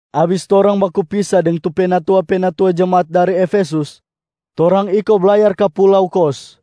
Abis torang baku pisa deng tu penatua-penatua jemaat dari Efesus, torang iko blayar ka pulau Kos.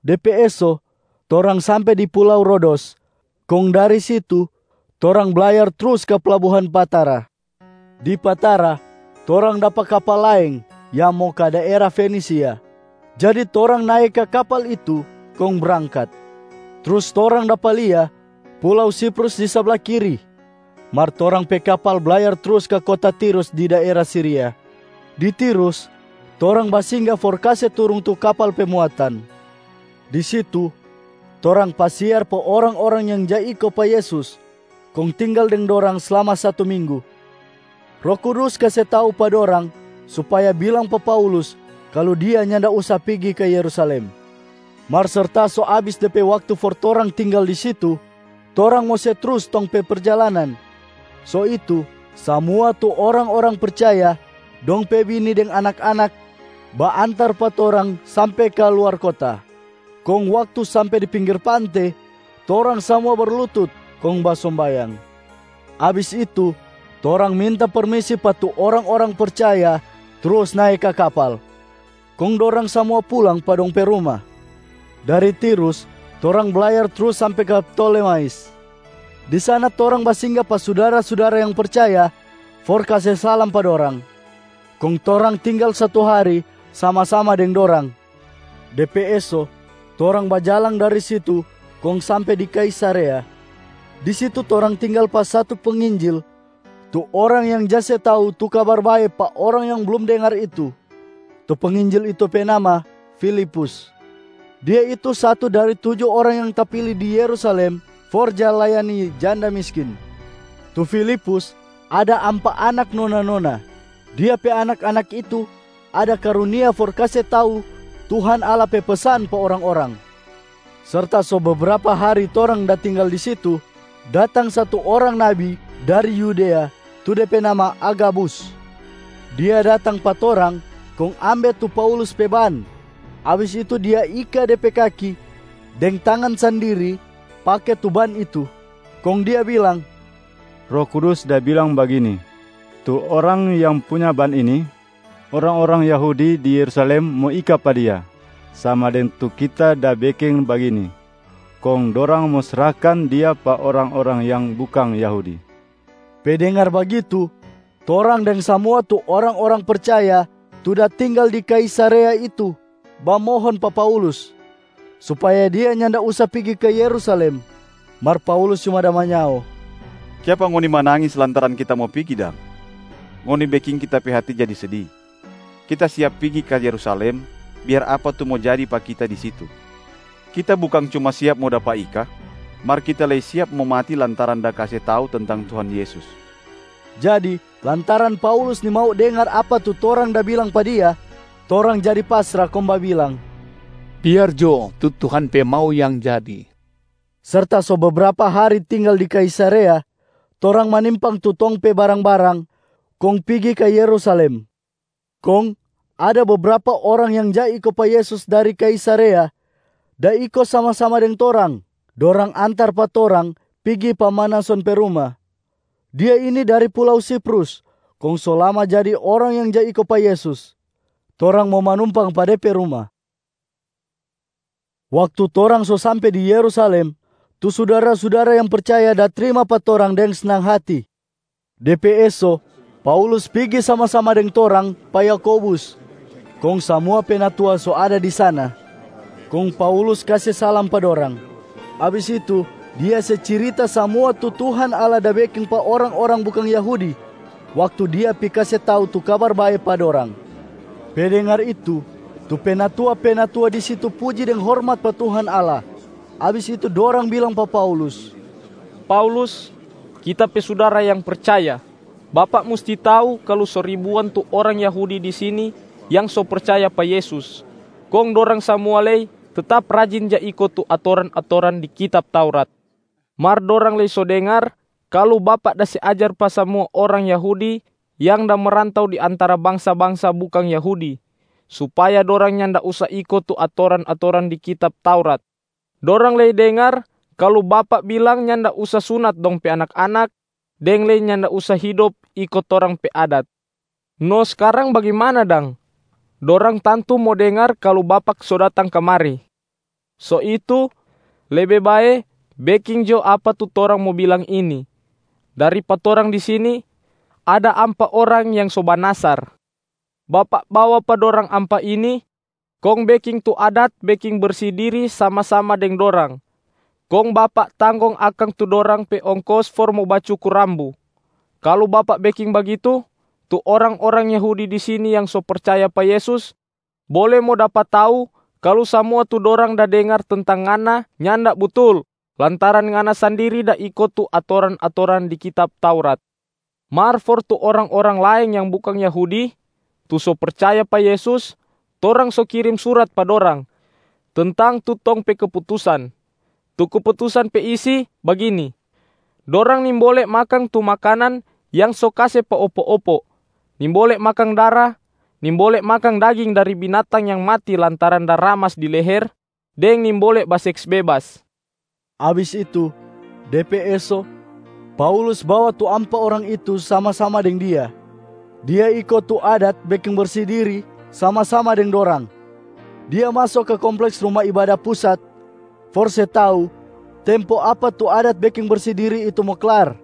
De pe eso, torang sampe di pulau Rodos kong dari situ torang blayar trus ka plabuhan Patara. Di Patara torang dapa kapal laeng yang mo ka daera Fenisia, jadi torang nae ka kapal itu kong brangkat. Trus torang dapa lia pulau Siprus di sabla kiri, mar torang pe kapal blayar trus ka kota Tirus di daera Siria. Di Tirus, torang basingga for kase turung tu kapal pe muatan. Di situ, torang pasiar pa orang-orang yang ja iko pa Yesus kong tinggal deng dorang slama satu minggu. Roh Kudus kase tau pa dorang supaya bilang pa Paulus kalu dia nyanda usa pigi ka Yerusalem. Mar serta so abis de pe waktu for torang tinggal di situ, torang mo se trus tong pe perjalanan. So itu samua tu orang-orang percaya, dong pe bini deng anak-anak baantar pa torang sampe ka luar kota. Kong waktu sampe di pinggir pante, torang samua berlutut kong basombayang. Abis itu torang minta permisi pa tu orang-orang percaya trus nae ka kapal, kong dorang samua pulang pa dong pe ruma. Dari Tirus torang blayar trus sampe ka Ptolemais. Di sana torang basingga pa sudara-sudara yang percaya for kase salam pa dorang, kong torang tinggal satu hari sama-sama deng dorang. De pe eso torang bajalang dari situ kong sampe di Kaisarea. Di situ torang tinggal pa satu penginjil tu orang yang ja se tau tu Kabar Bae pa orang yang blum dengar itu, tu penginjil itu pe nama Filipus. Dia itu satu dari tuju orang yang tapili di Yerusalem for ja layani janda miskin. Tu Filipus ada ampa anak nona-nona. Dia pe anak-anak itu ada karunia for kase tau Tuhan Allah pe pesan pa orang-orang. Serta so bebrapa hari torang da tinggal di situ, datang satu orang nabi dari Yudea tu de pe nama Agabus. Dia datang pa torang kong ambe tu Paulus pe ban. Abis itu dia ika de pe kaki deng tangan sandiri pake tu ban itu, kong dia bilang, “Roh Kudus da bilang bagini, ‘Tu orang yang punya ban ini, orang-orang Yahudi di Yerusalem mo ika pa dia sama deng tu kita da beking bagini, kong dorang mo srahkan dia pa orang-orang yang bukang Yahudi.’” Pe dengar bagitu, torang deng samua tu orang-orang percaya tu da tinggal di Kaisarea itu bamohon pa Paulus supaya dia nyanda usa pigi ka Yerusalem. Mar Paulus cuma da manyao, “Kiapa ngoni manangis lantaran kita mo pigi dang? Ngoni beking kita pe hati jadi sedi. Kita siap pigi ka Yerusalem biar apa tu mo jadi pa kita di situ. Kita bukang cuma siap mo dapa ika, mar kita lei siap mo mati lantaran da kase tau tentang Tuhan Yesus.” Jadi lantaran Paulus nimau dengar apa tu torang da bilang pa dia, torang jadi pasra kong babilang, “Biar jo tu Tuhan pe mau yang jadi.” Serta so bebrapa hari tinggal di Kaisarea, torang manimpang tu tong pe barang-barang kong pigi ka Yerusalem. Kong ada bebrapa orang yang ja iko pa Yesus dari Kaisarea da iko sama-sama deng torang. Dorang antar pa torang pigi pa Manason pe ruma. Dia ini dari pulau Siprus kong so lama jadi orang yang ja iko pa Yesus. Torang mo manumpang pa de pe ruma. Waktu torang so sampe di Yerusalem, tu sudara-sudara yang percaya da trima pa torang deng snang hati. De pe eso, Paulus pigi sama-sama deng torang pa Yakobus, kong samua penatua so ada di sana. Kong Paulus kase salam pa dorang. Abis itu, dia se cirita samua tu Tuhan Allah da beking pa orang-orang bukang Yahudi waktu dia pi kase tau tu Kabar Bae pa dorang. Pe dengar itu, tu penatua-penatua di situ puji deng hormat pa Tuhan Allah. Abis itu dorang bilang pa Paulus, “Paulus, kita pe sudara yang percaya, bapak musti tau kalu so ribuan tu orang Yahudi di sini yang so percaya pa Yesus, kong dorang samua lei tetap rajin ja iko tu atoran-atoran di kitab Taurat. Mar dorang lei so dengar kalu bapak da se ajar pa samua orang Yahudi yang da merantau di antara bangsa-bangsa bukang Yahudi, supaya dorang nyanda usa iko tu atoran-atoran di kitab Taurat. Dorang lei dengar kalu bapak bilang nyanda usa sunat dong pe anak-anak, deng lei nyanda usa hidop iko torang pe adat. No skarang, bagimana dang? Dorang tantu mo dengar kalu bapak so datang kamari. So itu, lebe bae beking jo apa tu torang mo bilang ini: dari pa torang di sini, ada ampa orang yang so banasar. Bapak bawa pa dorang ampa ini kong beking tu adat beking bersi diria sama-sama deng dorang, kong bapak tanggong akang tu dorang pe ongkos for mo bacukur rambu. Kalu bapak beking bagitu, tu orang-orang Yahudi di sini yang so percaya pa Yesus bole mo dapa tau kalu samua tu dorang da dengar tentang ngana nyanda butul lantaran ngana sandiri da iko tu atoran-atoran di kitab Taurat. Mar for tu orang-orang laeng yang bukang Yahudi tu so percaya pa Yesus, torang so kirim surat pa dorang tentang tu tong pe keputusan. Tu keputusan pe isi bagini: dorang nimbole makang tu makanan yang so kase pa opo-opo, nimbole makang dara, nimbole makang daging dari binatang yang mati lantaran da ramas di leher, deng nimbole baseks bebas.” Abis itu, de pe eso, Paulus bawa tu ampa orang itu sama-sama deng dia. Dia iko tu adat beking bersi diri sama-sama deng dorang. Dia maso ka kompleks Ruma Ibada Pusat for se tau tempo apa tu adat beking bersi diri itu mo klar,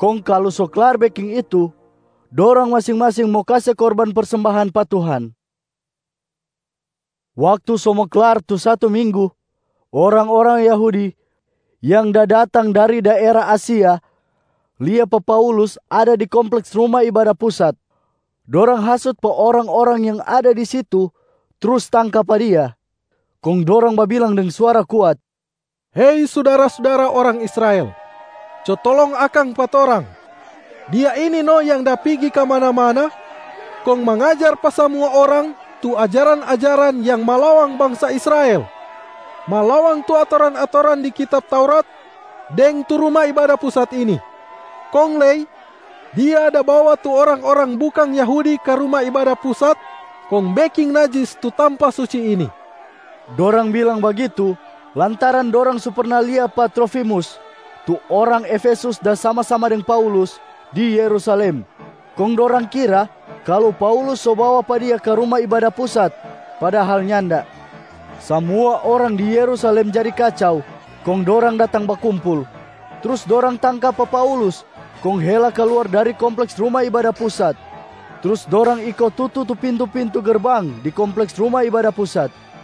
kong kalu so klar beking itu, dorang masing-masing mo kase korban persembahan pa Tuhan. Waktu so mo klar tu satu minggu, orang-orang Yahudi yang da datang dari daera Asia lia pa Paulus ada di kompleks Ruma Ibada Pusat. Dorang hasut pa orang-orang yang ada di situ trus tangka pa dia. Kong dorang babilang deng suara kuat, “Hei sudara-sudara orang Israel, co tolong akang pa torang! Dia ini no yang da pigi kamana-mana kong mangajar pa samua orang tu ajaran-ajaran yang malawang bangsa Israel, malawang tu atoran-atoran di kitab Taurat deng tu Ruma Ibada Pusat ini! Kong lei, dia da bawa tu orang-orang bukang Yahudi ka Ruma Ibada Pusat kong beking najis tu tampa suci ini!” Dorang bilang bagitu lantaran dorang so perna lia pa Trofimus tu orang Efesus da sama-sama deng Paulus di Yerusalem, kong dorang kira kalu Paulus so bawa pa dia ka Ruma Ibada Pusat, padahal nyanda. Samua orang di Yerusalem jadi kacau kong dorang datang bakumpul. Trus dorang tangka pa Paulus kong hela kaluar dari kompleks Ruma Ibada Pusat, trus dorang iko tutu tu pintu-pintu gerbang di kompleks Ruma Ibada Pusat.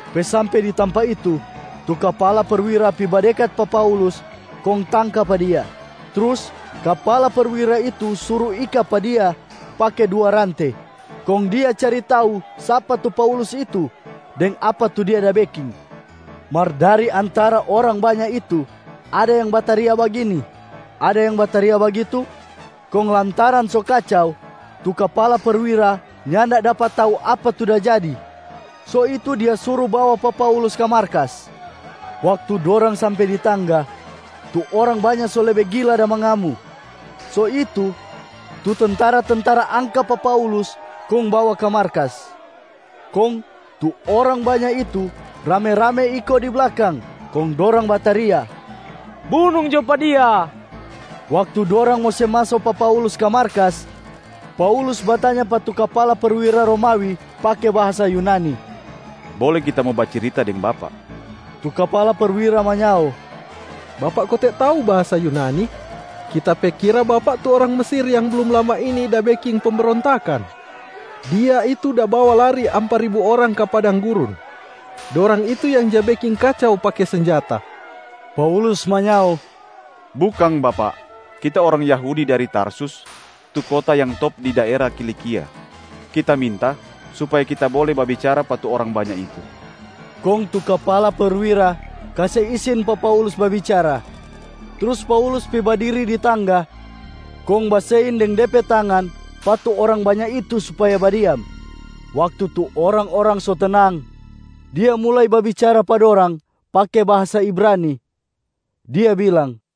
Pe sampe di tampa itu, tu kapala perwira pi badekat pa Paulus kong tangka pa dia. Trus kapala perwira itu suru ika pa dia pake dua rante, kong dia cari tau sapa tu Paulus itu deng apa tu dia da beking. Mar dari antara orang banya itu ada yang bataria bagini, ada yang bataria bagitu, kong lantaran so kacau, tu kapala perwira nyanda dapa tau apa tu da jadi. So itu dia suru bawa pa Paulus ka markas. Waktu dorang sampe di tangga, tu orang banya so lebe gila da mangamu, so itu tu tentara-tentara angka pa Paulus kong bawa ka markas. Kong tu orang banya itu rame-rame iko di blakang, kong dorang bataria, “Bunung jo pa dia!” Waktu dorang mo se maso pa Paulus ka markas, Paulus batanya pa tu kapala perwira Romawi pake bahasa Yunani, “Bole kita mo bacirita deng bapak?” Tu kapala perwira manyao, “Bapak kote tau bahasa Yunani? Kita pe kira bapak tu orang Mesir yang blum lama ini da beking pembrontakan. Dia itu da bawa lari ampa ribu orang ka padang gurun. Dorang itu yang ja beking kacau pake senjata.” Paulus manyao, “Bukang bapak. Kita orang Yahudi, dari Tarsus, tu kota yang top di daera Kilikia. Kita minta supaya kita bole babicara pa tu orang banya itu.” Kong tu kapala perwira kase isin pa Paulus babicara. Trus Paulus pi badiri di tangga kong basein deng de pe tangan pa tu orang banya itu supaya badiam. Waktu tu orang-orang so tenang, dia mulai babicara pa dorang pake bahasa Ibranib, dia bilang,